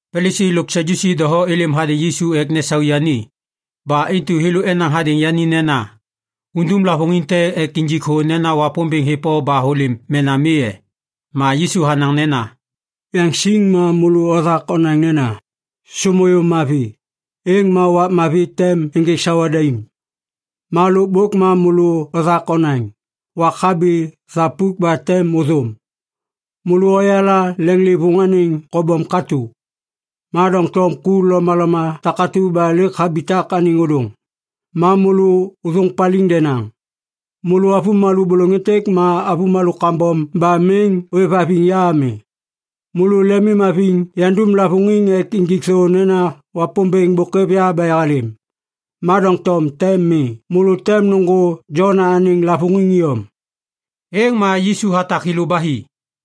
Palisi lo Sadyusi doho êlêm hadêŋ Yisu ek nesaê yani. Ba intu thêlô enaŋ hadêŋ yani nena, “Undum lavôŋiŋ te ek injik thô nena Wapômbêŋ hêv o ba hôlêm mena mi e?” Ma Yisu hanaŋ nena, “Yaŋsiŋ ma môlô othak onaŋ nena, ‘Sômuyum mavi, êŋ ma wak mavi tem ênjêk sawa daim.’ Ma lôkbôk ma môlô othak onaŋ, ‘Wak habi thapuk ba tem ôthôm.’ Môlô oyala leŋlêvôŋ anêŋ kobom katô. Ma doŋtom ku lomaloma takatu ba lêk habitak anêŋ ôdôŋ, ma môlô ôthôŋ paliŋ denaŋ. Môlô avômalô bôlôŋ êntêk ma avômalô kambom ba miŋ ôêvhaviŋ ya ami. Môlô lemimhaviŋ yandum lavôŋiŋ ek injik thô nena Wapômbêŋ bôk hêv ya ba yahalêm, ma doŋtom tem mi. Môlô tem nôŋgô Jona anêŋ lavôŋiŋ iyom.” Êŋ ma Yisu hatak thêlô ba hi.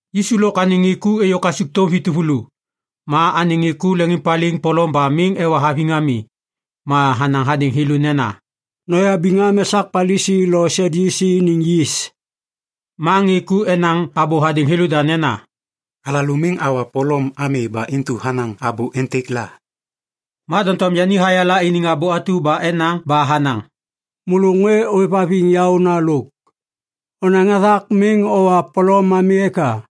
Yisu lôk anêŋ ŋê ku êyô kasukthôm vi tuvulu. Ma anêŋ ŋê ku leŋiŋpaliŋ polom ba miŋ ewa haviŋ ami. Ma hanaŋ hadêŋ thêlô nena, “Noyabiŋ am esak Palisi lo Sadyusi iniŋ yis.” Ma ŋê ku enaŋ abô hadêŋ thêlôda nena, “Alalô miŋ awa polom ami ba intu hanaŋ abô êntêk la.” Ma doŋtom yani hayala iniŋ abô atu ba enaŋ ba hanaŋ, “Môlô ŋê ôêvhaviŋ yaôna lôk. Onaŋ hathak miŋ owa polom ami eka?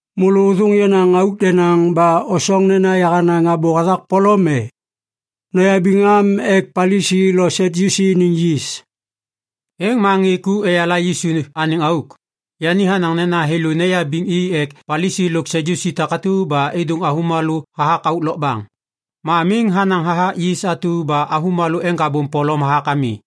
“Môlô ôthôŋ yenaŋ auk denaŋ ba osoŋ nena yahanaŋ abô hathak polom e? Noyabiŋ am ek Palisi lo Sadyusi iniŋ yis!” Êŋ ma ŋê ku eyala Yisu anêŋ auk. Yani hanaŋ nena thêlô neyabiŋ i ek Palisi lo Sadyusi takatu ba êdôŋ avômalô hathak auk lokbaŋ. Ma miŋ hanaŋ hathak yis atu ba avômalô eŋgabôm polom hathak ami.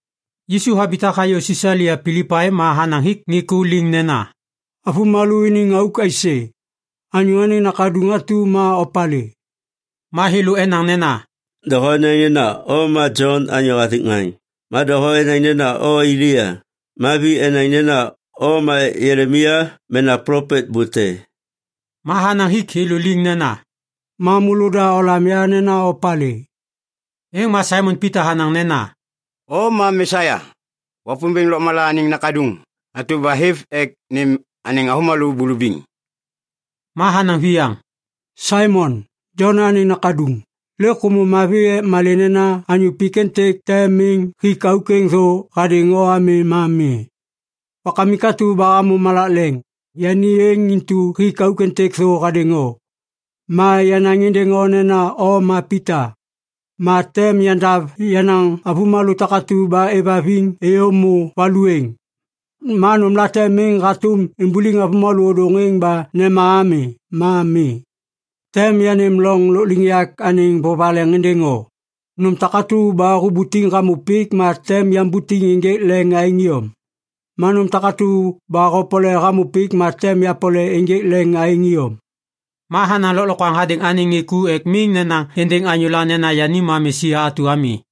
Yisu habitak hayô Sisalia Pilipai ma hanaŋ hik ŋê ku liŋ nena, “Avômalô iniŋ auk aisê? Anyô Anêŋ Nakaduŋ atu ma opalê?” Ma thêlô enaŋ nena, “Doho enaŋ nena o ma Jon anyô hathik ŋaŋ. Ma doho enaŋ nena o Elia. Ma vi enaŋ nena o ma Jelemaia mena plopet bô te.” Ma hanaŋ hik thêlô liŋ, “Ma môlôda olam ya nena opalê?” Êŋ ma Saimon Pita hanaŋ nena, “O ma Mesia, Wapômbêŋ lôkmala anêŋ Nakaduŋ atu ba hêv ek nêm anêŋ avômalô bulubiŋ.” Ma hanaŋ viyaŋ, “Saimon, Jona anêŋ nakaduŋ, lêk hômô mavi. Ek malê nena anyô pik êntêk te miŋ hik auk êŋ thô hadêŋ o ami, ma mi. Wakamik atu ba hamô malak leŋ, yani êŋ intu hik auk êntêk thô hadêŋ o. Ma yanaŋ êndêŋ o nena o ma Pita. Ma tem yandav yenaŋ avômalô takatu ba êvhaviŋ êyô êmô valu êŋ. Ma nômlate miŋ hatôm imbuliŋ avômalô ôdôŋ êŋ ba nema ami ma mi. Tem yanêm loŋ lôkliŋyak anêŋ vovaleŋ êndêŋ o. Nôm takatu ba hubutiŋ hamô pik ma tem yambutiŋ ênjêk leŋ aêŋ iyom. Ma nôm takatu ba hopole hamô pik ma tem yapole ênjêk leŋ aêŋ iyom.” Ma hanaŋ lôklokwaŋ hadêŋ anêŋ ŋê ku ek miŋ nenaŋ êndêŋ anyôla nena yani ma Mesia atu ami.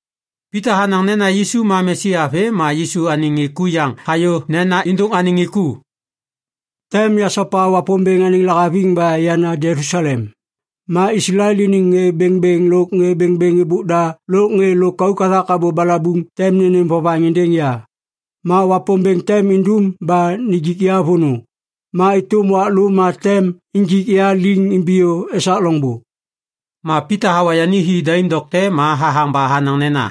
Pita hanaŋ nena Yisu ma Mesia vêm ma Yisu anêŋ ku yaŋ hayô nena êndôŋ anêŋ ŋê ku, “Tem yasopa Wapômbêŋ anêŋ lahaviŋ ba yana Jelusalem. Ma Islael iniŋ ŋê bêŋbêŋ lôk ŋê bêŋbêŋ êbôk da lôk ŋê lôkauk hathak abô balabuŋ tem nênêm vovaŋ êndêŋ ya. Ma Wapômbêŋ tem indum ba nijik ya vônô. Ma êtôm wak lô ma tem injik ya liŋ imbiyô esak loŋbô.” Ma Pita hawa yani hi daim dokte ma hathaŋ ba hanaŋ nena,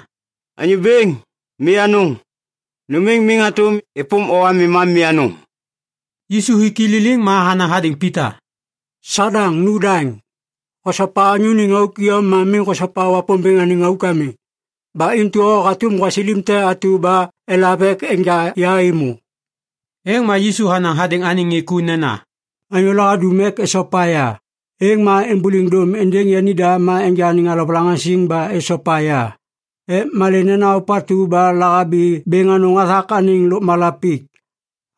“Anyô Bêŋ, mi anôŋ! Nôm êŋ miŋ hatôm êpôm o ami ma mi anôŋ!” Yisu hik i liliŋ ma hanaŋ hadêŋ Pita, “Sadaŋ, nu daŋ! Hosopa anyô iniŋ auk iyom ma miŋ hosopa Wapômbêŋ anêŋ auk ami. Ba intu o hatôm gwasilim te atu ba elav ek enja ya êmô.” Êŋ ma Yisu hanaŋ hadêŋ anêŋ ŋê ku nena, “Anyôla hadum ek esopa ya, êŋ ma êmbôliŋ dôm êndêŋ yanida ma enja anêŋ alovalaŋaŋsiŋ ba esopa ya. Ek malê nena ôpatu ba lahabi bêŋ anôŋ hathak anêŋ lôkmala pik,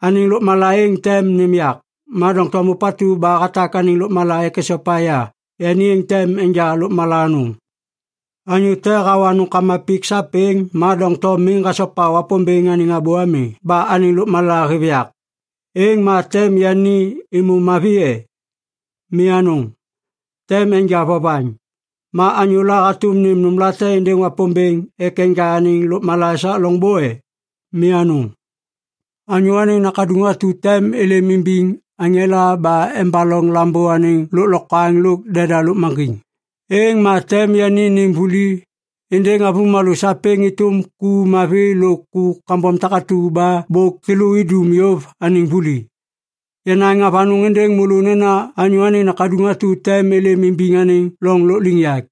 anêŋ lôkmala êŋ tem nêm yak. Ma doŋtom ôpatu ba hatak anêŋ lôkmala ek hasopa ya, yani êŋ tem enja lôkmala anôŋ. “Anyô te hawa nômkama pik sapêŋ ma doŋtom miŋ hasopa Wapômbêŋ anêŋ abô ami ba anêŋ lôkmala hêv yak, êŋ ma tem yani êmô mavi e? Mi anôŋ, tem enja vovaŋ. Ma anyôla hatôm nêm nômlate êndêŋ Wapômbêŋ ek enja anêŋ lôkmala esak loŋbô e? Mi anôŋ! Anyô Anêŋ Nakaduŋ atu tem êlêm imbiŋ aŋela ba embaloŋ Lambô anêŋ lôklokwaŋ lôk deda lôkmaŋgiŋ. Êŋ ma tem yani nêm vuli êndêŋ avômalô sapêŋ êtôm ku mavi lôk ku kambom takatu ba bôk thêlô idum yôv anêŋ vuli. Yanaŋ avanôŋ êndêŋ môlô nena Anyô Anêŋ Nakaduŋ atu tem êlêm imbiŋ anêŋ loŋ lôkliŋyak.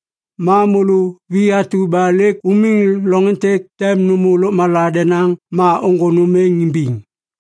Ma môlô vi atu ba lêk umiŋ loŋ êntêk tem nômô lôkmala denaŋ ma ôŋgô nôm êŋ imbiŋ.”